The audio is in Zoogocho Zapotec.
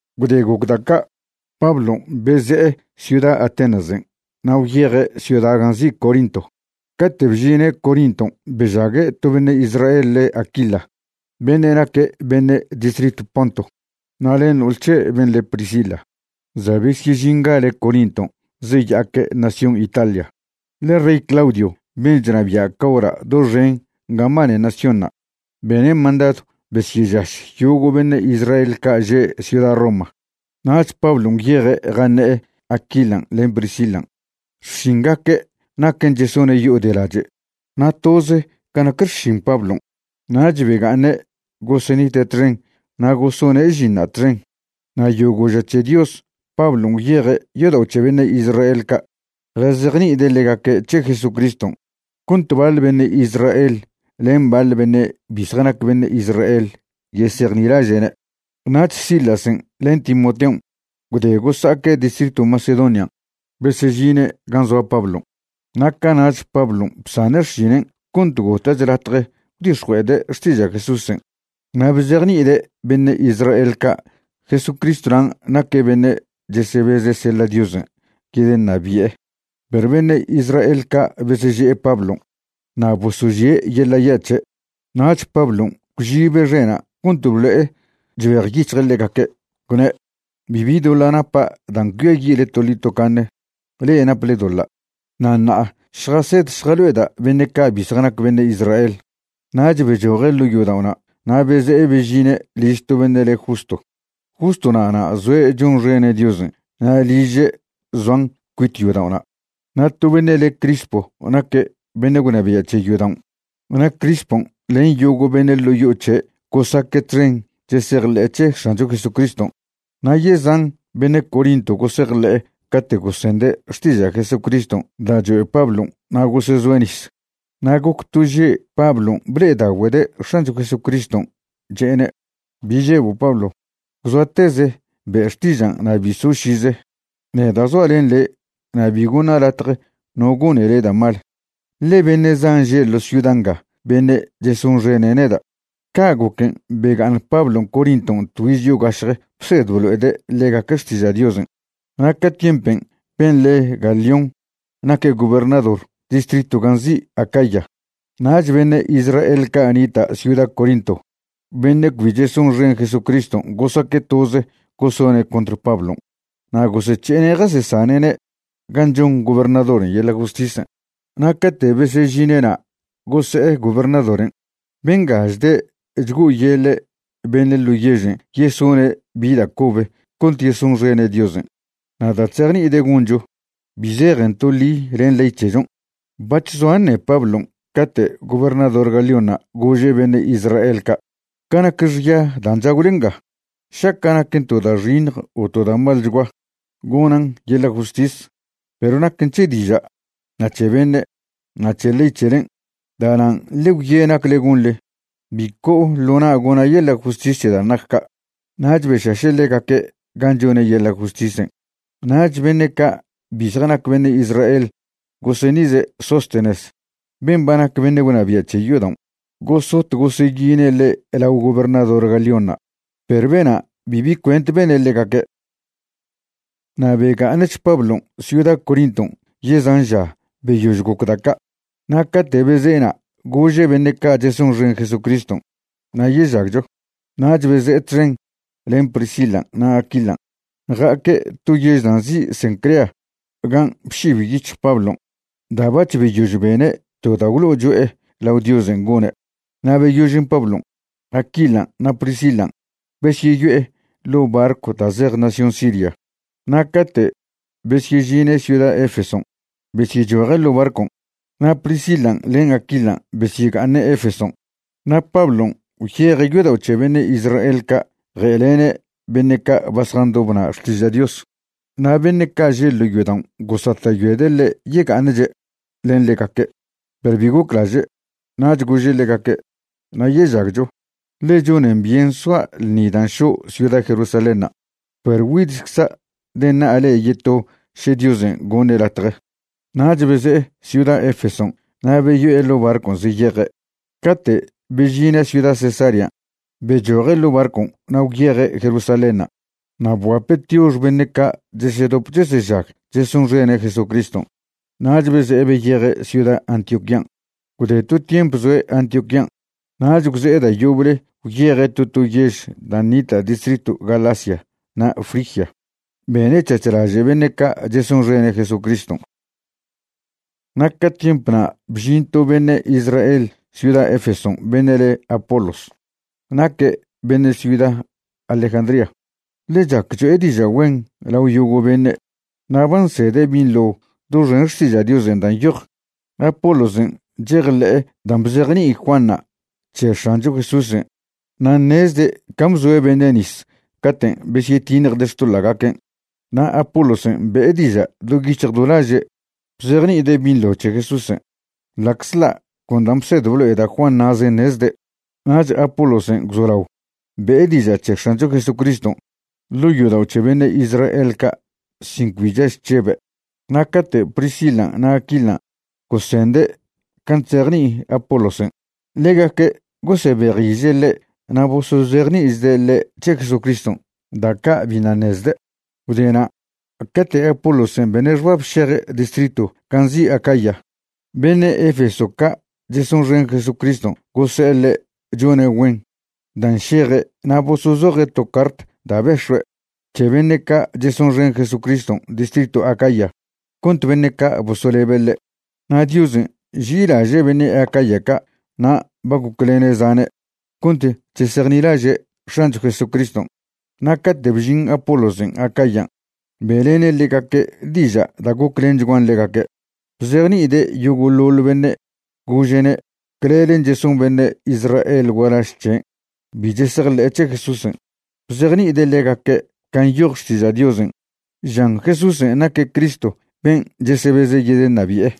Gwde goc da' ca', Pablon' beze'e ciuda Atenasen' na' gwyeje' ciuda gan' nzi' Corinto. Cate' bžine' Corinton' bežague' to beṉe' Israel le' Aquila beṉe' naque' beṉe' distritw Ponto, na' len no'ol c̱he' ben' le Priscila. Za' besyežingale' Corinton' zeya'aque' nación Italia, ḻe rey Claudio, ben' chnabia' ca hora' doxen gan' mbane naciónṉa', bene' mandadw besyežaš yogo' beṉe' Israel ca' že' ciuda Roma. Nach Pablon' gwyeje' jaṉe'e Aquilan' len Priscilan'. Xšingaque' naquen chesone' yo'o de lache', na' toze ca nac xšin Pablon'. Nach bega'aṉe' gosenite' txen na' gosone' žinṉa' txen. Na' yogo' ža c̱he Dios Pablon' gwyeje' yodao' c̱he beṉe' Israel ca' jazejni'ide' ḻegaque' c̱he Jesucriston', cont baḻ beṉe' Israel len baḻ beṉe' bi zjanac beṉe' Israel yesejnilaže'ne'. Nach Silasen' len Timoteon' gwde gosa'aque' distritw Macedonian' besežine' gan' zoa Pablon', na' cana'ch Pablon' bsane' xšinen' cont gota'ch latje gwdix̱jue'ede' xtiža' Jesúsen' na' bzejni'ide' beṉe' Israel ca' Jesucristwnan' naque' beṉe' chesebeze' seḻa' Diosen' yedeṉabi'e. Perw beṉe' Israel ca' beseže'e Pablon' na' bosožie' yeḻa' ya' c̱he'. Nach Pablon' gwšibe' xe'na' cont blo'e chbejyic̱hje' ḻegaque', gwne': ―Bibi doḻa' napa' dan' cuiayi'le toḻi tocaṉe. Le'e naple doḻa'. Na' ṉa'a šjased šjalo'eda' beṉe' ca' bi zjanac beṉe' Israel. Nach bechoje' ḻo' yodao'na' na' beze'e bežine' liž to beṉe' le Justo. Justo na'na' zoe' chonxene' Diosen' na' liže' zoan cuit yodao'na'. Na' to beṉe' le' Crispo naque' beṉe' gwnabia' c̱he yodaon'. Na' Crispon' len yogo' beṉe' ḻo' yo'o c̱he' gosaque' txen chesejḻe'e c̱he X̱ancho Jesucriston'. Na' yezan beṉe' Corinto gosejḻe'e cate' gosende' xtiža' Jesucriston' da' choe' Pablon' na' gosezoe' nis. Na' goc to že' Pablon' ble'edagüede' X̱ancho Jesucriston', che'ene': ―Bi žebo' Pablo. Gwzoateze be' xtižan' na' bi so' šize. Neda' zoa' len le' na' bi goṉa' latje no gone le' da' mal, ḻe beṉe' zan že' ḻo ciuda nga beṉe' chesonxene' neda'. Ca' goquen' bega'aṉ Pablon' Corinton' tgüiz yogašje bsed blo'ede' ḻegaque' xtiža' Diosen'. Na' ca tiempen' ben' le Galión naque' gobernador distritw gan' nzi' Acaya. Nach beṉe' Israel ca' nita' ciuda Corinto beṉe' cbi chesonxen Jesucriston' gosaque' toze gosone' contr Pablon'. Na' gosec̱he'ene' jasesane'ne' gan' chon gobernadoren' yeḻa' justisen'. Na' cate' besežine'na' gose'e gobernadoren': ―Benga chde' chgo'oyeḻe' beṉe' ḻo' yežen' yesone' bi da' cobe cont yesonxene' Diosen' na' da' chzejni'ide' goncho, bi zejen to ḻi len ley c̱hechon'. Bac̱h zoa ṉe Pablon' cate' gobernador Galiónṉa' gože' beṉe' Israel ca': ―Ca nac xya dan' chagwle nga, šaca' naquen to da' xiṉj o to da' malchgua, gonan' yeḻa' justis. Perw naquen c̱he diža', na' c̱he beṉe', na' c̱he ley c̱helen'. Da'nan' ḻe gwye' nacle gonḻe. Bi co'o ḻo na' gona' yeḻa' justis c̱he dan' nac ca'. Nach bešaše' ḻegaque' gan' chone' yeḻa' justisen'. Nach beṉe' ca' bi zjanac beṉe' Israel goseṉize' Sóstenes ben' ba nac beṉe' gwnabia' c̱he yodaon', gosot goseyine' ḻe' lao gobernador Galiónṉa', perw bena' bibi cuent bene' ḻegaque'. Na' bega'aṉch Pablon' ciuda Corinton' yezan ža beyož goc da' ca', na' cate' beze'ena' gože' beṉe' ca' chesonxen Jesucriston': “Nayežagcho”, nach beze'e txen len Priscilan' na' Aquilan'. Ja'aque' to yež da' nzi' Cencrea gan' bšib yic̱hj Pablon' da' bac̱h beyož bene' to da' gwlo'o cho'e lao Diosen' gone'. Na' beyožen' Pablon', Aquilan' na' Priscilan' besyeyo'e ḻo' barcw da' zej nación Siria. Na' cate' besyežine' ciuda Efeson' besyechoje' ḻo' barcon', na' Priscilan' len Aquilan' besyega'aṉe' Efeson'. Na' Pablon' gwyeje' yodao' c̱he beṉe' Israel ca' je'lene' beṉe' ca' ba zjandob na' xtiža' Dios. Na' beṉe' ca' že' ḻo' yodaon' gosata'yoede' ḻe' yega'aṉche' len ḻegaque', perw bi goclaže'. Nach gože' ḻegaque': ―Nayežagcho, ḻe chonen byen soa' ḻṉi dan' šo' ciuda Jerusalénṉa', perw güidchcza' deṉa'a le'e yeto še Diosen' goṉe' latje. Nach beze'e ciuda Efeson' na' beyo'e ḻo' barcon' zeyeje'. Cate' bežine' ciuda Cesarean' bechoje' ḻo barcon' na' gwyeje' Jerusalénṉa' na' bguape' tiox beṉe' ca' chesedop chesežag chesonxene' Jesucriston'. Nach beze'e beyeje' ciuda Antioquían'. Gwde to tiemp zoe' Antioquían', nach gwze'e da' yoble gwyeje' to to yež dan' nita' distritw Galacia na' Frigia, bene' c̱hac̱h laže' beṉe' ca' chesonxene' Jesucriston'. Na' ca tiemp na' bžin to beṉe' Israel ciuda Efeson' beṉe' le Apolos. Naque' beṉe' ciuda Alejandría. Ḻe' chac cho'e diža' güen lao yogo' beṉe', na' ba nsede' binḻo doxen Xtiža' Diosen' dan' nyoj. Apolosen' chejḻe'e dan' bzejni'i Juanṉa' c̱he X̱ancho Jesúsen' na' ṉezde' can' bzoe' beṉe' nis caten' besyetiṉjde' xtoḻa'gaquen'. Na' Apolosen' be'e diža' do yic̱hj do laže' bzejni'ide' binḻo c̱he Jesúsen', ḻa'czḻa' con dan' bsed blo'e da' Juan na'zen' ṉezde'. Nach Apolosen' gwzolao be'e diža' c̱he X̱ancho Jesucriston' ḻo' yodao' c̱he beṉe' Israel ca' sin cbi chaž chžebe'. Na' cate' Priscilan' na' Aquilan' gosende' can' chzejni'i Apolosen', ḻegaque' gosebejiže' ḻe' na' bosozejni'ichde' ḻe' c̱he Jesucriston' da' ca' biṉa' ṉezde'. Gwdena' cate' Apolosen' bene' xbab šeje' distritw gan' nzi' Acaya, beṉe' Efeso ca' chesonxen Jesucriston' gose'e ḻe' chone' güen dan' šeje' na' bosozoje' to cart da' bex̱ue' c̱he beṉe' ca' chesonxen Jesucriston' distritw Acaya cont beṉe' ca' bosolebe' ḻe'. Na' Diosen' nži'ilaže' beṉe' Acaya ca' na' ba goclene' zane' cont chesejnilaže' X̱ancho Jesucriston'. Na' cate' bžin Apolosen' Acayan' be'lene' ḻegaque' diža' da' goclenchguan ḻegaque'. Bzejni'ide' yogo'ḻoḻ bene' gože'ne' clelen' cheson beṉe' Israel gualaž c̱hen' bi chesejḻe'e c̱he Jesúsen'. Bzejni'ide' ḻegaque' can' nyoj Xtiža' Diosen' žan Jesúsen' naque' Cristo ben' chesebeze' yedeṉabi'e.